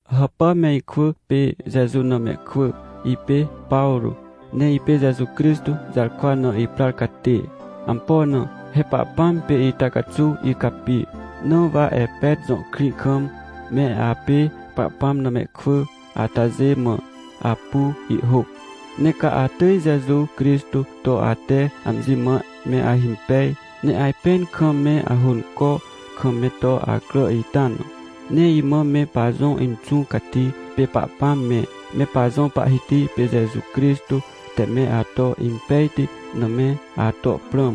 Hàpà me ikwỳ pê Jeju na mehkwỳ, ipê Pawrô, ne ipê Jeju Crixtô jarkwa na iprar catê. Ampo na? He Pahpãm pê ita caxuw icapi. Na wa Epet jõ krĩ kam, me apê Pahpãm na mehkwỳ atajê mã, apu ihhôc. Ne ca atỳj Jeju Crixtô to ate amji mã me ahimpej, ne ajpẽn kam me ahônco kam me to acrà ita na. Ne imã me pajõ Inxũ Cati pê Pahpãm me, me pajõ Pahhiti pê Jeju Crixtô te me ato impejti na me ato prãm,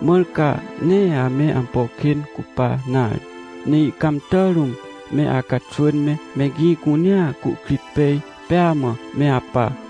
mãr ca nee ame ampo kên cupa nare, ne ihcãmtà rũm me acaxwỳn me, me gĩ cunea cuhkrit pej pêa mã me apa.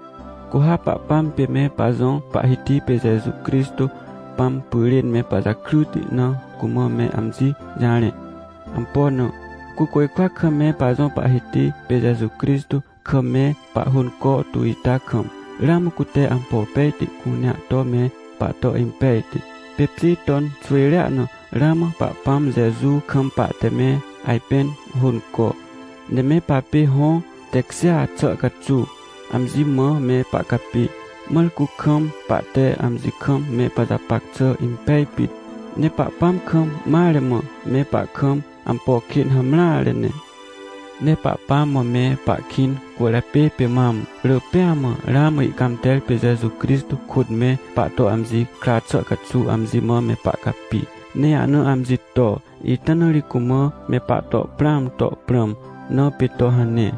Cu ha Pahpãm pê me pajõ Pahhiti pê Jeju Crixtô Pãm pyrên me pajakryti na cumã me amji jarẽ. Ampo na? Cu côjkwa kam me pajõ Pahhiti pê Jeju Crixtô kam me pahhônco tu ita kam, ramã cute ampo pejti cunea to me pahto impejti. Pê pjê ton xwỳjrea na, ramã Pahpãm Jeju kam pahte me ajpẽn hônco, ne me papê hõ tekjêa xà caxuw, amji mã me pahcapi. Mãr cu kam pahte amji kam me pajapac xà impej pit, ne Pahpãm kam mare mã me pahkam, ampo kên hamreare ne. Ne Pahpãm mã me pahkĩn cwỳrjapê pê mam, rỳ pêa mã, ramã ihcãmter pê Jeju Crixtô kôt me pahto amji kra xà caxuw amji mã me pahcapi, ne ahna amji to. Ita na ri cumã me pahto prãam to prãm na pê to hane.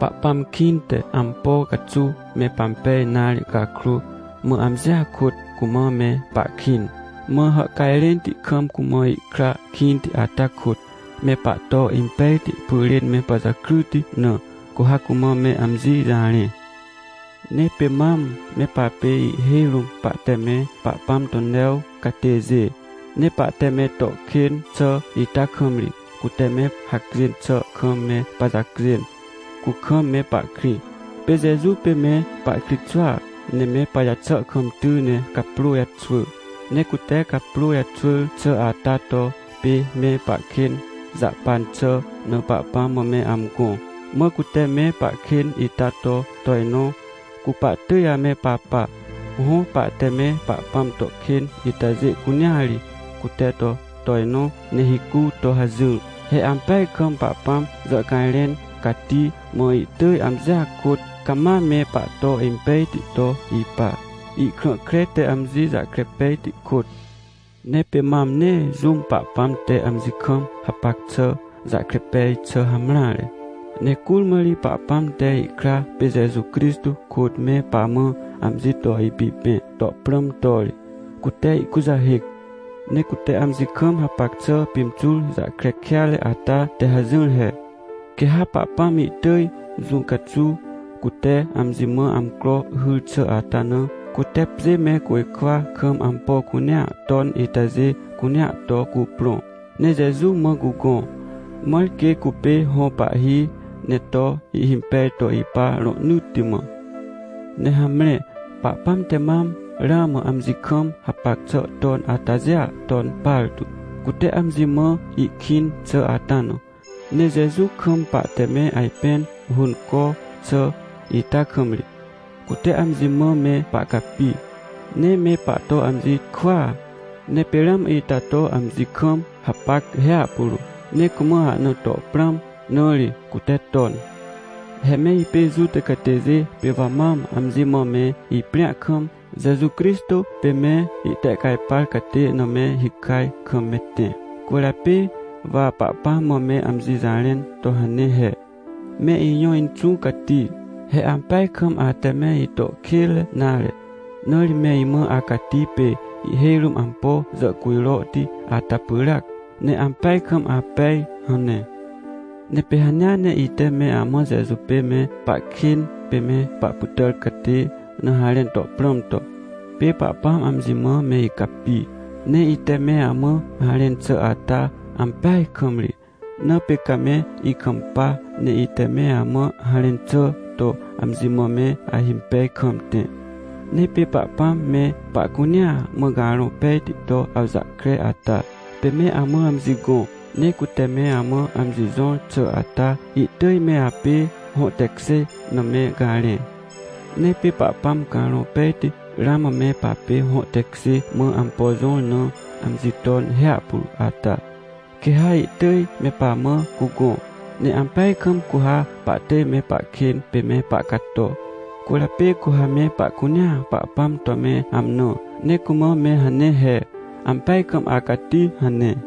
Pahpãm kĩnte, ampo caxuw me pampej nare cakrô, mã amjia kôt cumã me pahkĩn. Mã hàhcajrẽnti kam cumã ikra kĩnti ata kôt, me pahto impejti pyrên me pajakryti na, cu ha cumã me amji jarẽ. Ne pê mam me papê ihhêj rũm pahte me Pahpãm to new catêjê. Ne pahte me to kên xà ita kam ri, cute me hacjên xà kam me pajacjên, cu kam me pahkrĩ. Pê Jeju pê me pahkritxwỳa, ne me pajaxà kam ty ne caprô jaxwỳ. Ne cute caprô jaxwỳr xà ata to pê me pahkên jahpan xà na Pahpãm mã amgõ, mã cute me pahkên ita to tojnõ, cu pahtỳj ame papa. Hõ, pahte me Pahpãm to kên itajê cunea ri, cute to tojnõ, ne hicu to hajỹr. He ampeaj kam Pahpãm jàhcajrẽn cati, mã ihtỳj amjia kôt cama me pahto impejti to ipa, ihkrã kre te amji jahkre pejti kôt. Ne pê mam nee jũm Pahpãm te amji kam hapac xà jahkre pej xà hamreare. Ne curmã ri Pahpãm te ihkra pê Jeju Crixtô kôt me pamã amji to ipipẽ to prãm to ri, cute ihkujahêc. Ne cute amji kam hapac xà pimxur jahkre kêatre ata te hajỹr he. Quê ha Pahpãm ihtỳj jũ caxuw cute amji mã amcro hyr xà ata na, cute pjê me côjkwa kam ampo cunea ton itajê cunea to cuprõ, ne Jeju mã cugõ, mãr quê cupê hõ pahhi, ne to ihhimpej to ipa rohnỳtti mã. Ne hamre, Pahpãm te mam ramã amji kam hapac xà ton atajêa ton partu, cute amji mã ihkĩn xà ata na. Ne Jeju kam pahte me ajpẽn hônco xà ita kam ri, cute amji mã me pahcapi, ne me pahto amji kwỳa. Ne pê ramã ita to amji kam hapac hiahpuro, ne cumã ahna to prãm, na ri cute ton. He me ipê Juta catêjê, pê wa mam amji mã me iprĩa kam, Jeju Crixtô pê me itehcajpar catê na me hikaj kam me tẽ. Cwỳrjapê wa Pahpãm mã me amji jarẽn to hane he: — Me ijõ Inxũ Cati, he ampeaj kam ate me ito kênre nare, na ri me imã acati pê ihhêj rũm ampo jàhcujrohti ata pyràac, ne ampeaj kam apej! — hane. Ne pê hanea ne ite me amã Jeju pê me pahkên pê me pahpytàr catê na harẽn to prãm to, pê Pahpãm amji mã me icapi. Ne ite me amã harẽn xà ata, ampeaj kam ri. Na pê ca me ikampa, ne ite me amã harẽn xà to amji mã me ahimpej kam tẽ. Ne pê Pahpãm me pahcunea mã Carõ Pejti to awjahkre ata, pê me amã amji gõ. Ne cute me amã amji jõr xà ata, ihtỳj me apê hõ tekjê na me garẽ. Ne pê Pahpãm Carõ Pejti ramã me papê hõ tekjê mã ampo jõr na amji ton hiahpuro ata, quê ha ihtỳj me pamã cugõ, ne ampeaj kam cu ha pahtỳj me pahkên pê me pahcato. Cwỳrjapê cu ha me pahcunea Pahpãm to me amnã ne cumã me hane he: — Ampeaj kam acati! — hane.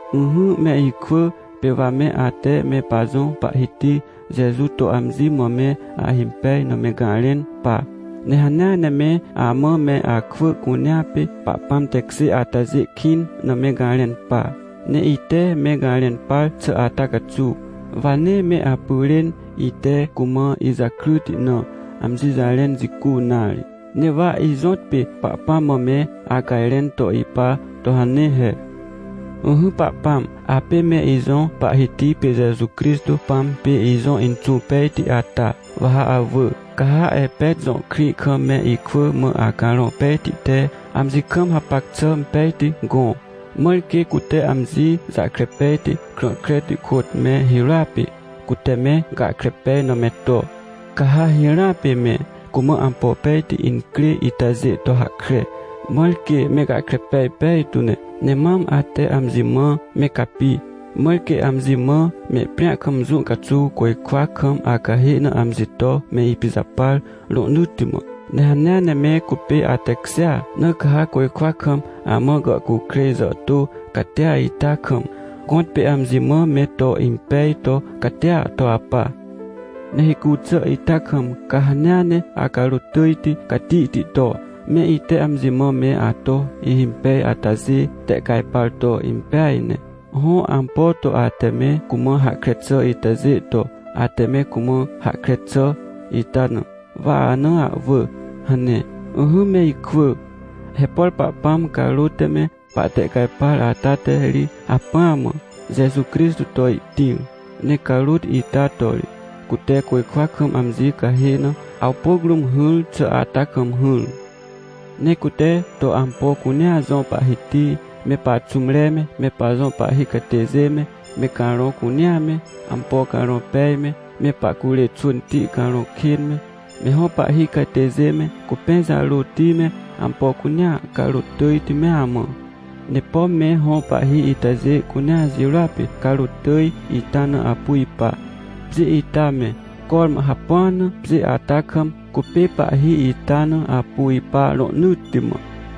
Ỹhỹ, me ikwỳ, pê wa me ate me pajõ Pahhiti Jeju to amji mã me ahimpej na me garẽn pa. Ne hanea ne me amã me akwỳ cunea pê Pahpãm tekjê atajê kĩn na me garẽn pa. Ne ite me garẽn par xà ata caxuw, wa nee me apyrên, ite cumã ijakryti na, amji jarẽn jicu nare. Ne wa ijõtpê Pahpãm mã me acajrẽn to ipa to hane he: — Ỹhỹ Pahpãm, apê me ijõ Pahhiti pê Jeju Crixtô Pãm pê ijõ Inxũ Pejti ata, wa ha awỳ, ca ha Epet jõ krĩ kam me ikwỳ mã Acarõ Pejti te amji kam hapac xà pejti gõ, mãr quê cute amji jahkre pejti, krã kreti kôt me hirôa pê, cute me gahkre pej na me to. Ca ha hirãa pê me cumã ampo pejti incrê itajê to hahkre, mãr quê me gahkre pej pejtu ne. Ne mam, ate amji mã me capi, mãr quê amji mã mehprĩa kam jũ caxuw côjkwa kam acahê na amji to me ipijapar rohnỳtti mã. Ne hanea ne me cupê atekjêa, na ca ha côjkwa kam amã gàhcukrêj jàhtô catia ita kam, gõtpê amji mã me to impej to catia to apa. — Ne hicu xà ita kam ca hanea ne acarôt tỳjti catihti to, me ite amji mã me ato ihimpej atajê tehcajpar to impeaj ne. Hõ, ampo to ate me cumã hahkre xà itajê to, ate me cumã hahkre xà ita na, wa ana ahwỳ — hane. Ỹhỹ me ikwỳ, he por Pahpãm carôt te me pahtehcajpar ata te ri hacpỹa mã Jeju Crixtô to ihtĩr. Ne carôt ita to ri cute côjkwa kam amji cahê na, awpôc rũm hỹr xà ata kam hỹr. Ne cute to ampo cunea jõ Pahhiti, me paxũmre me, me pajõ pahhi catêjê me, me carõ cunea me, ampo carõ pej me, me pahcurê xwỳnti carõ kên me, me hõ pahhi catêjê me, cupẽ jarôti me, ampo cunea carôt tỳjti mea mã. Ne pom me hõ pahhi itajê cunea jirôa pê carôt tỳj ita na apu ipa. Pjê ita me, cormã hapua na pjê ata kam, cupê pahhi ita na apu ipa rohnỳtti mã.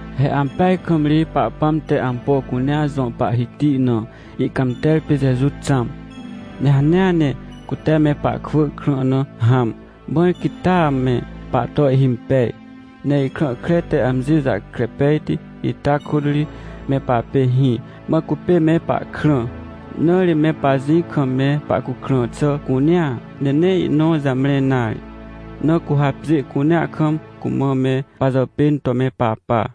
He ampeaj kam ri Pahpãm te ampo cunea jõ Pahhiti na, ihcãmter pê Jeju xãm. Ne hanea ne cute me pahkwỳ krã na hãm, mãr quê taa me pahto ihhimpej. Ne ihkrã kre te amji jahkre pejti ita kôt ri me papê hĩ, mã cupê me pahkrã. Na ri me pajĩ kam me pahcukrã xà cunea, ne nee ihnõ jamre nare. Na cu ha pjê cunea kam cumã me pajàpên to me papa.